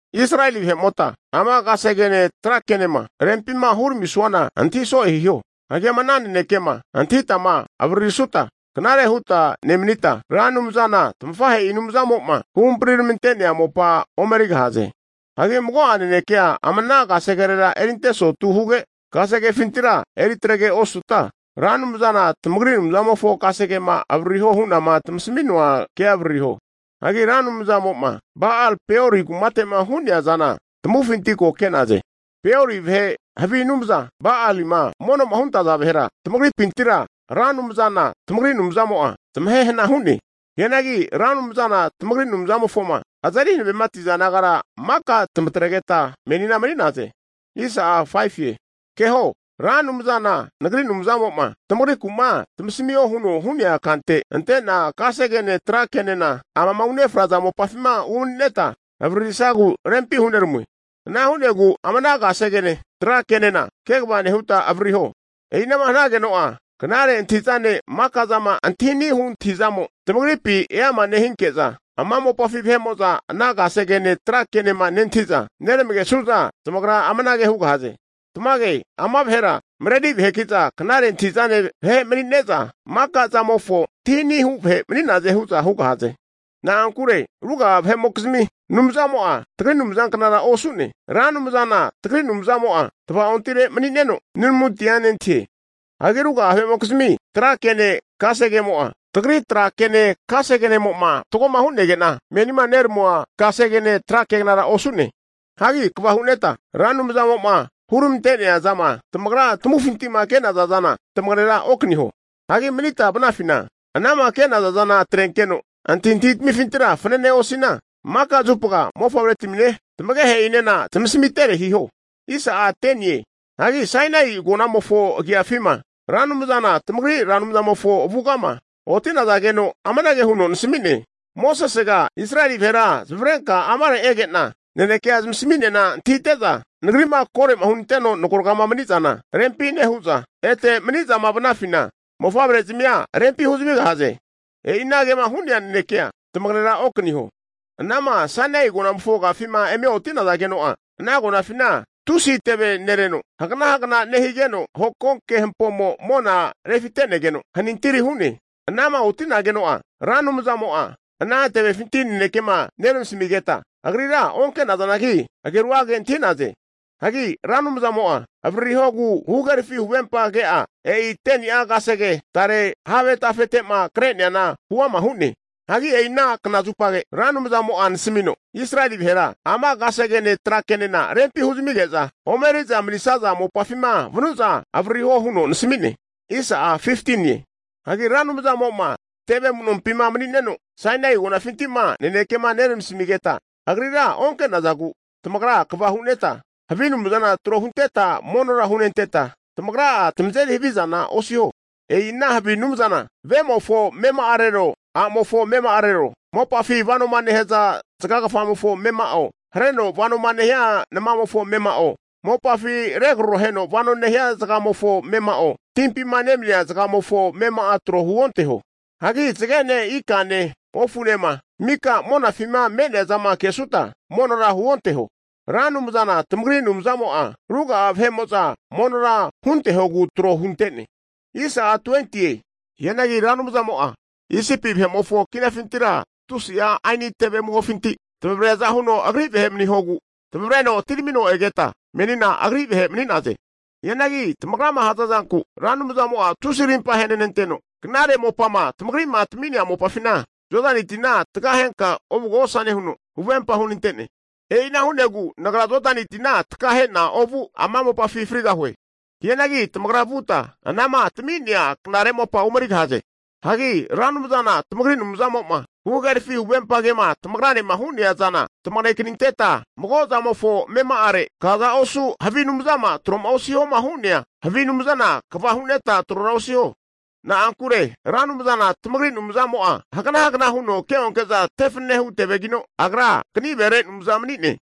Israeli vahe'mota ama kasegene tra kenema rempima huramisuana antahi so'e hiho. Hagi ama ana nanekema antahitama avaririsuta, knare huta nemanita, Ra Anumzana tafahe'i Anumzamo'ma huhampri ramante'nea mopa omerigahaze. Hagi mago'a nanekea ama ana kasegerera erinte sotu huge, kasegefintira eritrege osuta, Ra Anumzana tamagri Anumzamofo kasegema avaririhoma hu'nama tamasamua kea avaririho. Hagi Ra Anumzamo'ma Ba'al-Peori kumate'ma hu'nea zana tamavufinti ko ke'naze. Peori vahe havi anumza Balima mono'ma huntaza vahera tamagripintira Ra Anumzana tamagri Anumzamo'a zmahehana hu'ne. Hianagi Ra Anumzana tamagri Anumzamofoma, azeri hanavemati'naza nagara maka tamatregeta menina mani'naze. Keho, Ra Anumzana nagri Anumzamo'ma tamagriku'ma zamasmio huno'ma hu'nea kante ante'na kasegene tra kenena amama unefraza mopafima umani'neta avaririsagu rempi hunerami'noe. Ana hu'negu ama ana kasegene tra kenena kegava nehuta avaririho. E'inama hanageno'a, knare antahi'zane maka'zama antahi ani'hu antahizamo tamagripina eama nehinke'za, ana mopafi vahe'mo'za ana kasegene tra ke'ma nentahi'za neramagesu'za zamagra amanage hugahaze, tamage ama vahera, mareri vaheki'za knare antahi'zane vahe mani'ne'za, maka zamofo antahi ani'hu vahe mani'naze hu'za hugahaze. Na'ankure ruga'a vahe'mokizmi anumzamo'a tagri Anumzanknara osu'ne. Ra Anumzana tagri Anumzamo'a tava'ontire mani'neno nunamuntia nentahie. Hagi ruga'a vahe'mokizmi tra kene kasegemo'a, tagri tra kene kasegenemo'ma fatgo hu'nege'na menima neramua kasegene tra kegnara osu'ne. Hagi kva hu'neta, Ra Anumzamo'ma huramante'nea zama tamagra tamavufinti'ma ke'naza zana tamagera okaniho. Hagi manita vanafina, anama ke'naza zana atrenkeno antahintahi tamifintira fananea osina, maka zupa mofavretamine tamagehe'inena zamasmitere hiho. Hagi Sainai agonamofo agiafima Ra Anumzana tamagri Ra Anumzamofo avugama oti'nazageno amanage huno nasami'ne, Mosesega Israeli vahera zamavarenka amare ege'na nanekea zamasmi'nena antahite'za, Nagri'ma kore'ma hunanteno nagoraga'ama mani zana rempi nehu'za, ete mani'zama vanafina mofavre'zimia rempi huzamigahaze. E'i anagema hu'nea nanekea tamagera okaniho. Anama Sainai agonamofo agafima eme oti'nazageno'a, ana agonafina tusi teve nereno hagana hagana nehigeno hokonke hampomo mona refite'negeno hanintiri hu'ne. Anama oti'nageno'a, Ra Anumzamo'a ana tevefinti nanekema neramasamigeta Agrira onke'nazanagi ageru'age antahi'naze. Hagi Ra Anumzamo'a avaririhogu huhagerafi huvempa ke'a e'i 10ni'a kasege tare have tafete'ma kre'neana huama hu'ne. Hagi e'i ana knazupage Ra Anumzamo'a nasmino, Israel vahera ama kasegene trakenena rempi huzamige'za omeriza manisaza mopafima vanu'za avaririho huno nasami'ne. Hagi Ra Anumzamo'ma teve amu'nompi mani'neno Sainai agonafinti'ma nanekema neramasamigeta, Agrira onke'nazagu tamagra kva huneta, havi anumzana tro hunteta monora hunenteta, tamagra'a tamazeri havizana osiho. E'i ana havi anumzana vemofo amema'arero a'mofo amema'arero, mopafi vanoma nehaza zagagafamofo amema'o, hareno vano nehia namamofo amema'o, mopafi regraroheno vano nehia zagamofo amema'o, timpima nemania nozamemofo amema'a tro huonteho. Hagi zagene ikane ofunema mika monafima me'neazama kesuta, monora huonteho. Ra Anumzana tamagri Anumzamo'a ruga'a vahe'mo'za monora huntehogu tro hunte'ne. Hianagi Ra Anumzamo'a Isipi vahe'mofo kinafintira tusi'a aini teve amuhofinti tamavreaza huno Agri vahe manihogu tamavreno atiramino egeta menina Agri vahe mani'naze. Hianagi tamagrama hazazanku Ra Anumzamo'a tusi rimpa ahenenanteno, knare mopama tamagri'ma tami'nea mopafina Jodani tina takahenka ovugosane huno huvempa hunante'ne. E'ina hu'negu nagra Jodani tina takahe'na ovu, ama mopafi frigahue. Hianagi tamagra vuta anama tami'nea knare mopa omerigahaze. Hagi Ra Anumzana tamagri Anumzamo'ma huhagerafi huvempa kema tamagranema hu'nea zana, tamagekaninketa mago zamofo amema'are kaza osu havi anumzama tro'ma osihoma hu'nea havi anumzana kva huneta trora osiho. Na'ankure Ra Anumzana tamagri Anumzamo'a haganahagana huno keonke'za tefananehu tevegino, Agra kanivere Anumza mani'ne.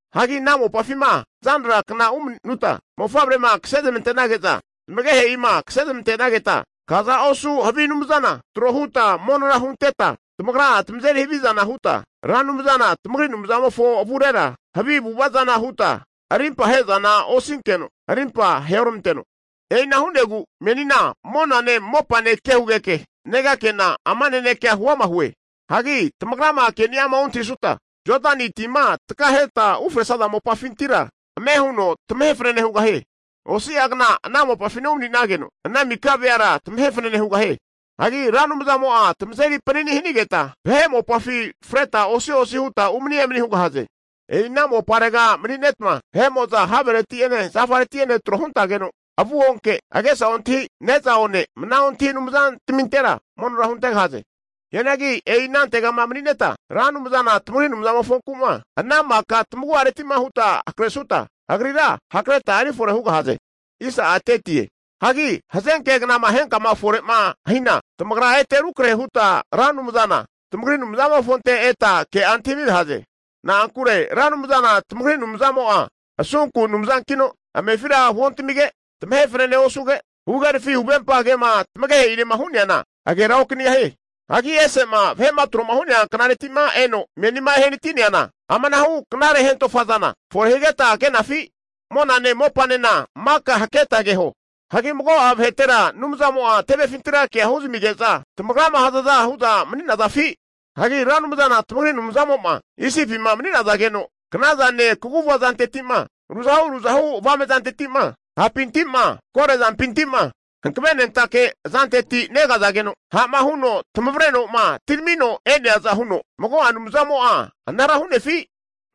Hagi ana mopafima zanra kna umani'nuta mofavrema kasezmante'nage'za tamagehe'ima kasezmante'nageta, kaza osu havi anumzana tro huta monora hunteta tamagra'a tamazeri havizana huta, Ra Anumzana tamagri Anumzamofo avurera havi avu'ava zana huta arimpa ahe'zana osinkeno arimpa aheoramanteno. E'ina hu'negu menina monane mopane ke hugeke negakena, ama nanekea huama hue. Hagi tamagrama keni'ama ontahisuta, Jodani tima takahetama ufresaza mopafintira ame huno tamahe fanane hugahie. Osi'agna ana mopafina umani'nageno, ana mika'a veara tamahe fanane hugahie. Hagi Ra Anumzamo'a tamazeri panini hanigeta, vahe mopafi freta osi'osi hutma umani emani hugahaze. E'ina moparega umani'netma vahe'mo'za havereti'ene zafareti'ene tro huntazageno avu onke, agesa ontahi, ne'za one, mna ontahi anumzantaminte monora huntegahaze. Hianagi e'i anantegama mani'neta Ra Anumzana tamagri Anumzamofonku'ma ana maka tamagu'areti'ma huta hakresuta, Agrira hakreta erifore hugahaze. Hagi hazanke knama henkama efore'ma hina, tamagra ete rukrehuta Ra Anumzana tamagri Anumzamofonte eta ke'a antahimigahaze. Na'ankure Ra Anumzana tamagri Anumzamo'a asunku Anumzankino, amefira huoantamige, tamahe fanane osuge, huhagerafi huvempa kema tamagehe'inema hu'neana agera okanigahie. Hagi ese'ma vahe'ma tro'ma hu'nea knareti'ma eno menima ehanati'neana, amanahu knare hentofazana fore higeta ke'nafi? Monane mopafinena maka haketa keho. Hagi mago'a vahetera anumzamo'a tevefintira kea huzamige'za tamagrama hazaza hu'za mani'nazafi? Hagi Ra Anumzana tamagri Anumzamo'ma Isipima mani'nazageno knazane kaguvazanteti'ma ruzahu ruzahu avame'zanteti'ma hapinti'ma korezampinti'ma hankavenentake azanteti negazageno ha'ma huno tamavreno'ma atiramino e'neaza huno, mago'a anumzamo'a anara hu'nefi?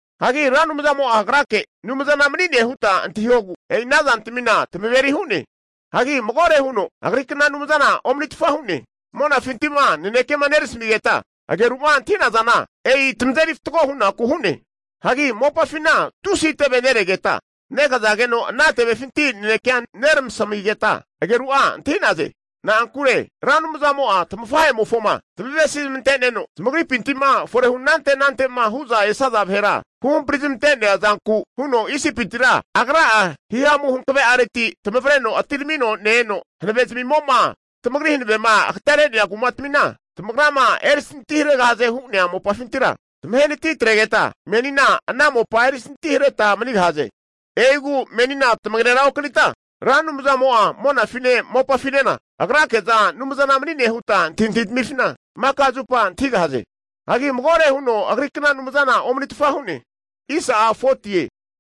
Hagi Ra Anumzamo'a Agrake Anumzana mani'ne huta antahihogu e'i ana zantamina tamaveri hu'ne. Hagi magore huno Agrikna anumzana omanitfa hu'ne. Monafinti'ma naneke'ma neramasmigeta ageru'ma antahi'nazana, e'i tamazeri fatgo hunaku hu'ne. Hagi mopafina tusi teve neregeta, negazageno ana tevefinti nanekea neramasamigeta ageru'a antahi'naze. Na'ankure Ra Anumzamo'a tamafahemofoma zamavesi zamante'neno zamagripinti'ma forehu anante anante'ma hu'za esaza vahera huhampri zamante'nea zanku huno Isipitira Agra'a himamu hankave'areti tamavreno atiramino ne-eno, hanave'zmimo'ma tamagri hanavema agatere'nea kumatamina tamagrama erisantiharegahaze hu'nea mopafintira zamahe natitrenigeta, menina ana mopa erisintihareta manigahaze. E'igu menina tamagera okanita Ra Anumzamo'a monafine mopafinena Agrake'za Anumzana mani'ne huta antahintahi tamifina maka zupa antahigahaze. Hagi magore huno Agrikna anumzana omanitfa hu'ne.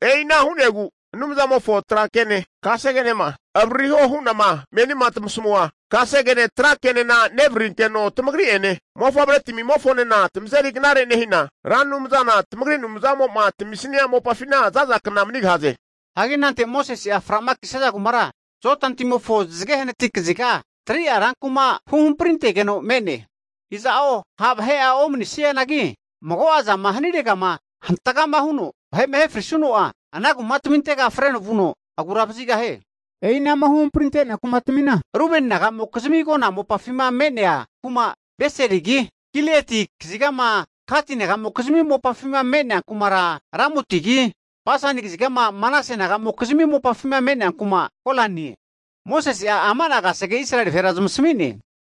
E'ina hu'negu Anumzamofo tra kene kasegenema avaririho hu'nama menima tamasamua kasegene trakenena nevaririnkeno tamagri'ene mofavretmimofonena tamazeri knare nehina, Ra Anumzana tamagri Anumzamo'ma tamisnia mopafina zaza kna manigahaze. Hagi anante Mosese'a fra'makisaza kumara Jodani timofona zage hanati kaziga 3'a rankuma huhamprintegeno me'ne. Iza'o ha' vahe'a omani'nesianagi mago'a zama haniregama hantga huno vahe'ma ahe frisuno'a, ana kumatamintega freno vuno aguravazigahie. E'i anama huhamprinte'nea kumatmina, Rubeni naga'mokizmi agona mopafima me'nea kuma Beserigi, Gilieti kazigama Gati nagamokizmi mopafima me'nea kumara Ramotigi, Basani kazigama Manase nagamokizmi mopafima me'nea kuma Golanie. Mosese'a ama'na kasege Israeli vahera zami'ne.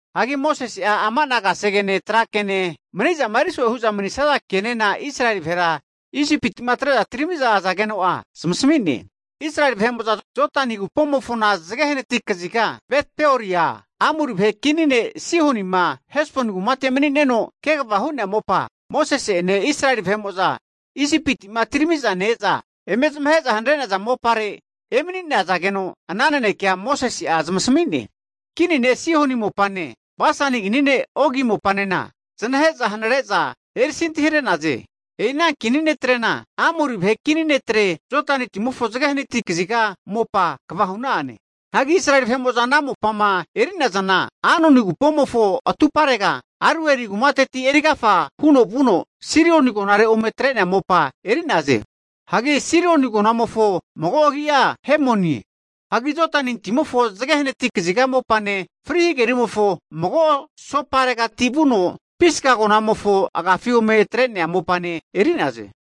Hagi Mosese'a ama'na kasegene trakene mani'zama erizo'ema hu'za manisaza kenena Israeli vahera Isipima atre'za atirami'za azageno'a zamasami'ne. Israeli vahe'mo'za Jodani agupomofona zage hanati kaziga Bet Peoria, Amori vahe kini ne' Sihonima Hesboni kumate mani'neno kegava hu'nea mopa, Mosese'ene Israeli vahe'mo'zanema Isipiti'ma atirami'za ne-eza eme zamahe'za hanare'naza mopare emani'nazageno ana nanekea Mosese'a zamasami'ne. Kini ne' Sihoni mopane Basani kini ne' Ogi mopanena zanahe'za hanare'za erisanti hare'naze. E'i ana kini netrena Amori vahe kini netre Jodani timofo zage hanati kaziga mopa kva hu'na'ane. Hagi Israeli vahe'mo'zama ana mopama eri'nazana Arnoni agupomofo atuparega Aroeri kumateti erigafa huno vuno Sirion agonare ome atre'nea mopa eri'naze. (Hagi Sirioni agonamofo mago agi'a Hemonie). Hagi Jodani timofo zage hanati kaziga mopane, Fri Hagerimofo mago sopa'aregati vuno Pisga agonamofo agafi ome atre'ne mopane eri'naze.